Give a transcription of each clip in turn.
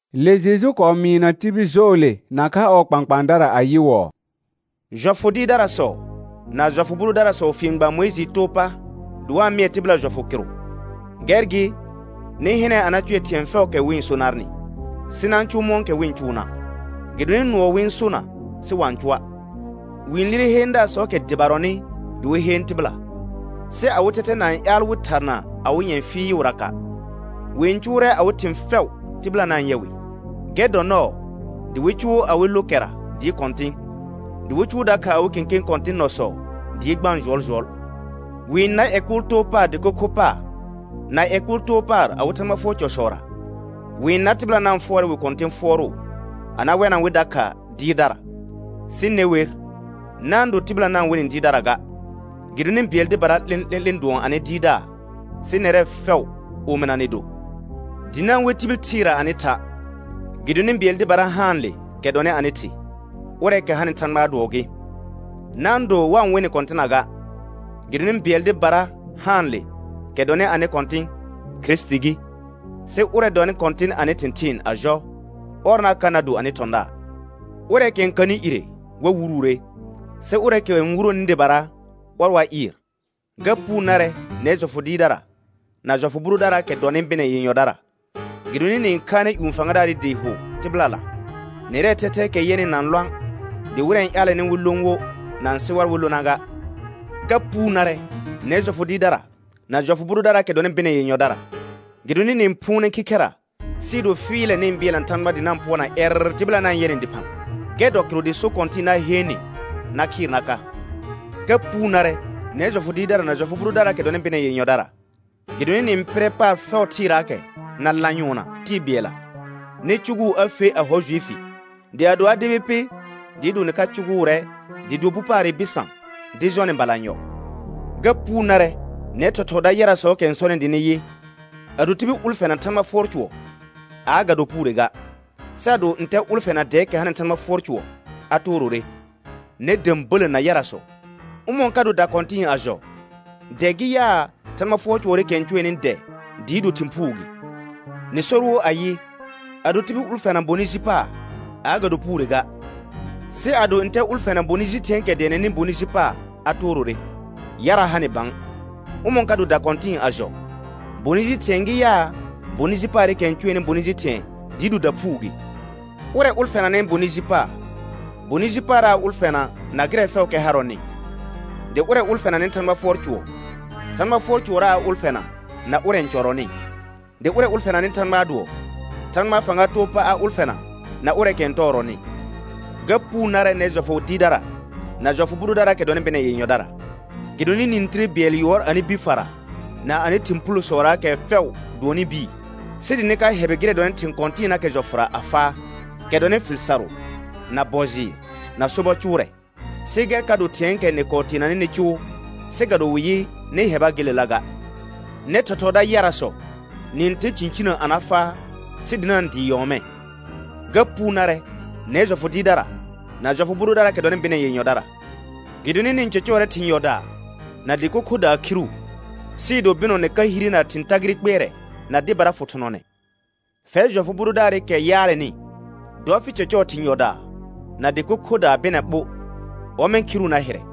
Le Jeju kɔɔ mɩɩna tibil jɔɔle nakha ɔɔ kpãkpãadara ayɩwɔɔ: Jɔfʋ dɩɩrdarasɔ na jɔfʋ bʋ dʋdarasɔ fien gba Mʋɩjɩɩ too pa dɩ wa-n mɩɛ tɩbɩla jɔfʋ kɩrʋ. Gɛr gɩ, nɩ hɩnɛ a na cʋɛ thɩ̃ɛ fɛʋʋkɛ wɩ-n so narnɩ, sɩ na-n cʋʋ mɔ̃kɛ wɩ-n cʋʋna', gɩdonɩ nʋɔ wɩ-n sona sɩ wa-n cʋa'. Wɩ-n lire heendaasɔɔkɛ dɩbarɔnɩ dɩ wɩ heen tɩbɩla, sɩ awɩ thɛthɛ na-n ƴaal wɩ tharna awɩ nyɛ̃ fɩɩʋraka'. Wɩ-n cʋʋrɛ awɩ thɩ̃ fɛʋ tɩbɩla na-n yɛ wɩ. Gɛr n dɔ nɔɔ dɩ wɩ cʋʋ awɩ lo kɛra dɩɩ kɔ̃tɩ̃, dɩ wɩ cʋʋ dakha awɩ kẽkẽ kɔ̃tɩ̃ nɔsɔ dɩɩ gbaan jʋɔljʋɔl. Wɩ-n nar ƴɛ kʋʋl too paar dɩko kho paar na ƴɛ kʋʋl too paar awɩ Thãgba fʋɔr cɔsɔra. Wɩ-n nar tɩbɩla na-n fʋɔrɛ wɩ kɔ̃tɩ̃ fʋɔrʋʋ a na wɛna wɩ dakha dɩɩrdara. Sɩ ne wer, na-n do tɩbɩla na-n we nɩ dɩɩrdara ga, gɩdonɩ bɩɛl dɩbara 'lẽ'lẽ'lẽ dʋɔn anɩ Dɩɩrdaar, sɩ nɛrɛ fɛʋ omɩna nɩ do. Dɩ na-n we tibil thɩɩra anɩ tha', gɩdonɩ bɩɛl dɩbara haanle kɛ dɔnɩ anɩ Thɩ, ʋrɛɛkɛ hanɩ Thãgbaa dʋɔ gɩ. Na-n do wa-n we nɩ kɔ̃tɩna ga, gɩdonɩ bɩɛl dɩbara haanle kɛ dɔnɩ anɩ Kɔ̃tɩ̃, Kirisiti gɩ. Sɩ ʋrɛ dɔnɩ kɔ̃tɩn anɩ thɩ̃thɩɩn a jɔ, ɔr na ka na do anɩ thɔ̃daar. Ʋrɛɛkɛ n kanɩ ire wa wuruure, sɩ ʋrɛɛkɛ n wuroni dɩbara, ɔr wa ɩɩr. Ga puu narɛ nɛr jɔfʋ dɩɩrdara na jɔfʋ bʋ dʋdaraakɛ dɔnɩ bɩnɛ yenyɔdara, gɩdonɩ nɩ-n khaanɛ ƴũ fãgadaarɩ dɩ hʋ tɩbɩlala, nɛrɛɛ thɛthɛɛkɛ yɛnɩ na-n lõa', dɩ wɩrɛ n ƴaalɛnɩ wɩ lõ wo na-n sɩ war wɩ lona ga. [Ga puu narɛ nɛr jɔfʋ dɩɩrdara na jɔfʋ bʋ dʋdaraakɛ dɔnɩ bɩnɛ yenyɔdara, gɩdonɩ nɩ-n phʋʋnɛ khikhɛra sɩɩ do fɩɩlɛ nɩ-n bɩɛlna Thãgba dɩ nɩ pʋɔrna ƴɛrr tɩbɩla na-n yɛ nɩ dɩphã. Gɛr dɔ kɩrʋ dɩ so kɔ̃tɩ̃ɩ na heen nɩ na khɩɩr na ka.] Ga puu narɛ nɛr jɔfʋ dɩɩrdara na jɔfʋ bʋ dʋdaraakɛ dɔnɩ bɩnɛ yenyɔdara, gɩdonɩ nɩ-n pɩrɛ paar fɛʋ thɩɩraakɛ na lanyʋɔnna tɩɩ bɩɛlla nɩ cʋgʋʋ a fe a hɔ Juifi. Dɩ ado a debi pɩ, dɩɩ do nɩ ka cʋgʋʋrɛ dɩ do bu paarɩ bɩsã dɩ jɔ nɩ balanyɔ. Ga puu narɛ nɛr thɔthɔɔda yarasɔɔkɛ n sɔnɩ dɩ nɩ yɩ: Ado tibil ʋlfɛna Thãgba fʋɔr cʋɔr aa, ga do puure ga. Sɩ ado ntɛ ʋlfɛna dɛɛkɛ hanɩ Thãgba fʋɔr cʋɔr, a toorore. Nɛr də̃bələ na yarasɔ, ʋmɔ̃ ka do dakɔ̃tɩ̃ɩ a jɔ? Dɛ gɩ yaa, Thãgba fʋɔr cʋɔrɩkɛ n cʋɛnɩ dɛ dɩɩ do thɩ̃ phuu gɩ? Nɩ sor wo ayɩ: Ado tibil ʋlfɛna bonɩ ji paar aa, ga do puure ga. Sɩ ado ntɛ ʋlfɛna bonɩ ji thɩ̃ɛɛkɛ dɛɛnɛnɩ bonɩ ji paar, a toorore. Yara ha nɩ bã, ʋmɔ̃ ka do dakɔ̃tɩ̃ɩ a jɔ? Bonɩ ji thɩ̃ɛ gɩ yaa, bonɩ ji paarɩkɛ n cʋɛnɩ bonɩ ji thɩ̃ɛ dɩɩ do daphuu gɩ? Ʋrɛ ʋlfɛnanɩ bonɩ ji paar, bonɩ ji paarra a ʋlfɛna na gɩrɛ fɛʋʋkɛ harɔnɩ. Dɩ ʋrɛ ʋlfɛnanɩ Thãgba fʋɔr cʋɔr, Thãgba fʋɔr cʋɔrra a ʋlfɛna na ʋrɛ n cɔrɔnɩ. Dɩ ʋrɛ ʋlfɛnanɩ Thãgbaa dʋɔ, Thãgbaa fãga too pa a ʋlfɛna na ʋrɛɛkɛ n tɔɔrɔnɩ. Ga puu narɛ nɛr jɔfʋ dɩɩrdara na jɔfʋ bʋ dʋdaraakɛ dɔnɩ bɩnɛ yenyɔdara, gɩdonɩ nɩ-n tire bɩɛl yʋɔr anɩ bi fara na anɩ thɩ̃ phulosɔraakɛ fɛʋ dʋɔnnɩ bii, sɩ dɩ nɩ ka hɛbɩ gɩrɛ dɔnɩ thɩ̃ kɔ̃tɩɩnaakɛ jɔfʋra a faa, kɛ dɔnɩ fɩl sarʋ, na bɔ jɩɩr, na sobɔ cʋʋrɛ. Sɩ gɛr ka do thɩ̃ɛɛkɛ nɩ kɔɔ teenanɩ nɩ cʋʋ, sɩ ga do wɩ yɩ nɩ hɛba gelela ga. Nɛr thɔthɔɔda yarasɔ, nɩ-n tɛr cĩcinə a na faa, sɩ dɩ na-n dɩɩ nyɔɔmɛ. Ga puu narɛ nɛr jɔfʋ dɩɩrdara na jɔfʋ bʋ dʋdaraakɛ dɔnɩ bɩnɛ yenyɔdara, gɩdonɩ nɩ-n cɔcɔɔrɛ thɩ̃ yɔdaa na dɩko khodaa khiru, sɩɩ do bɩnɔ nɩ ka hire na thɩ̃ tagɩrɩ kpɩɛrɛ na dɩbara fʋ thʋnɔnɛ. Fɛr jɔfʋ bʋ dʋdaarɩkɛ yaarɛnɩ, dɔ fɩ cɔcɔɔ thɩ̃ yɔdaa na dɩko khodaa bɩnɛ ɓo, ɔmɛ̃ khiru na hɩrɛ.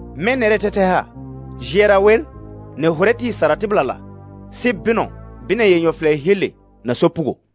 Mɛ̃ nɛrɛɛ thɛthɛ ha; jɩɛra wer, nɩ-n hʋrɛ tɩɩ sara tɩbɩlala, sɩ bɩnɔ, bɩnɛ yenyɔ fɩlɛ he le na sopugo.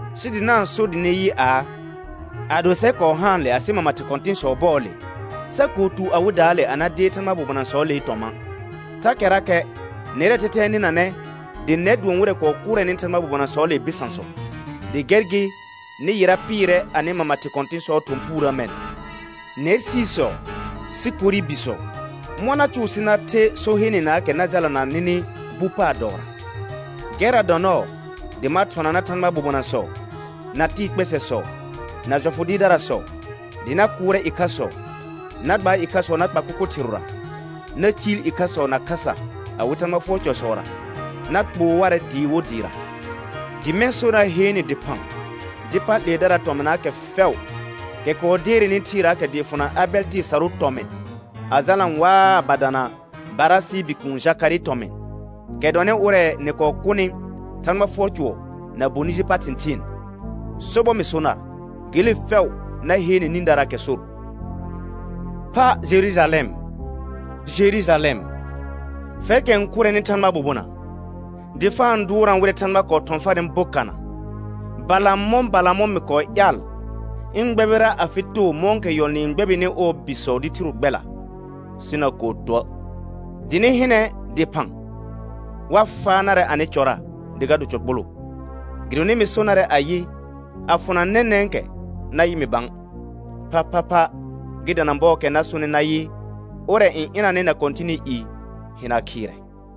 sɩ dɩ na-n so dɩ nɩ yɩ aa: Ado sɛr kɔɔ haanle asɩ mama thɩ kɔ̃tɩ̃sɔɔ bɔɔle, sa kɔɔ tu awɩdaale a na deer Thãgbaa bobonasɔɔlee tɔmã'. Thakɛrakɛ nɛrɛɛ thɛthɛ n nɩnanɛ, dɩ nɛr dʋɔn wɩrɛ kɔɔ kʋrɛnɩ Thãgbaa bobonasɔɔlee bɩsãsɔ. Dɩ gɛr gɩ nɩ yɩra pɩɩrɛ anɩ mama thɩ kɔ̃tɩ̃sɔɔ thɔ̃ puurə mɛ̃. Nɛr siisɔ, sikori bisɔ, mɔ̃ na cʋʋ sɩ na the so heenenaakɛ na jalana nɩnɩ bu paar dɔɔra? Gɛrra dɔ nɔɔ dɩ ma thɔna nar Thãgbaa bobonasɔ, na tɩɩ kpɛsɛsɔ, na jɔfʋ dɩɩrdarasɔ, dɩ na kʋʋrɛ ɩkhasɔ, na gba ɩkhasɔ na kpa kʋkʋ thɩrʋra, na ciil ɩkhasɔ na khasa awɩ Thãgba fʋɔr cɔsɔra, na kpoo warɛ dɩɩ wo dɩɩra; dɩ mɛ̃ sor na heen nɩ dɩphã dɩ pa 'leedaraa tɔmɩnaakɛ fɛʋ, kɛ kɔɔ deerenɩ thɩɩraakɛ dɩɩ fʋna Abɛl tɩɩ sarʋʋ tɔmɩ̃ a jalna waa a ba dana Barasɩɩ bikuun Jakarɩɩ tɔmɩ̃, kɛ dɔnɩ ʋrɛ nɩ kɔɔ kʋnɩ Thãgba fʋɔr cʋɔr na bonɩ ji pa thɩ̃thɩɩn. Sobɔr mɩ so nar, gele fɛʋ na heene nĩdaraakɛ sor. Pha Jerujalɛm, Jerujalɛm, fɛrkɛ n kʋrɛnɩ Thãgbaa bobona, dɩ fa-n dʋʋrna wɩrɛ Thãgba kɔɔ thɔ̃ farnɩ bokana, balamɔ̃ balamɔ̃ mɩ kɔɔ ƴaal ɩ̃ gbɛbɩra afɩ too mɔ̃kɛ yɔl nɩɩ n gbɛbɩnɩ ɔɔ bisɔ dɩ thiro gbɛla, sɩ na kɔɔ tuə'. Dɩ nɩ hɩnɛ dɩphã, wa faa narɛ anɩ cɔra dɩ ga do cɔ kpoloo, gɩdonɩ mɩ so narɛ ayɩ: A fʋna nɛnɛ̃kɛ na yɩ mɩ bã, phaphapha gɩ dana bɔɔkɛ na sonɩ nayɩ: «Ʋrɛ n ɩnanɩ na Kɔ̃tɩnɩ i hɩna khɩɩrɛ.»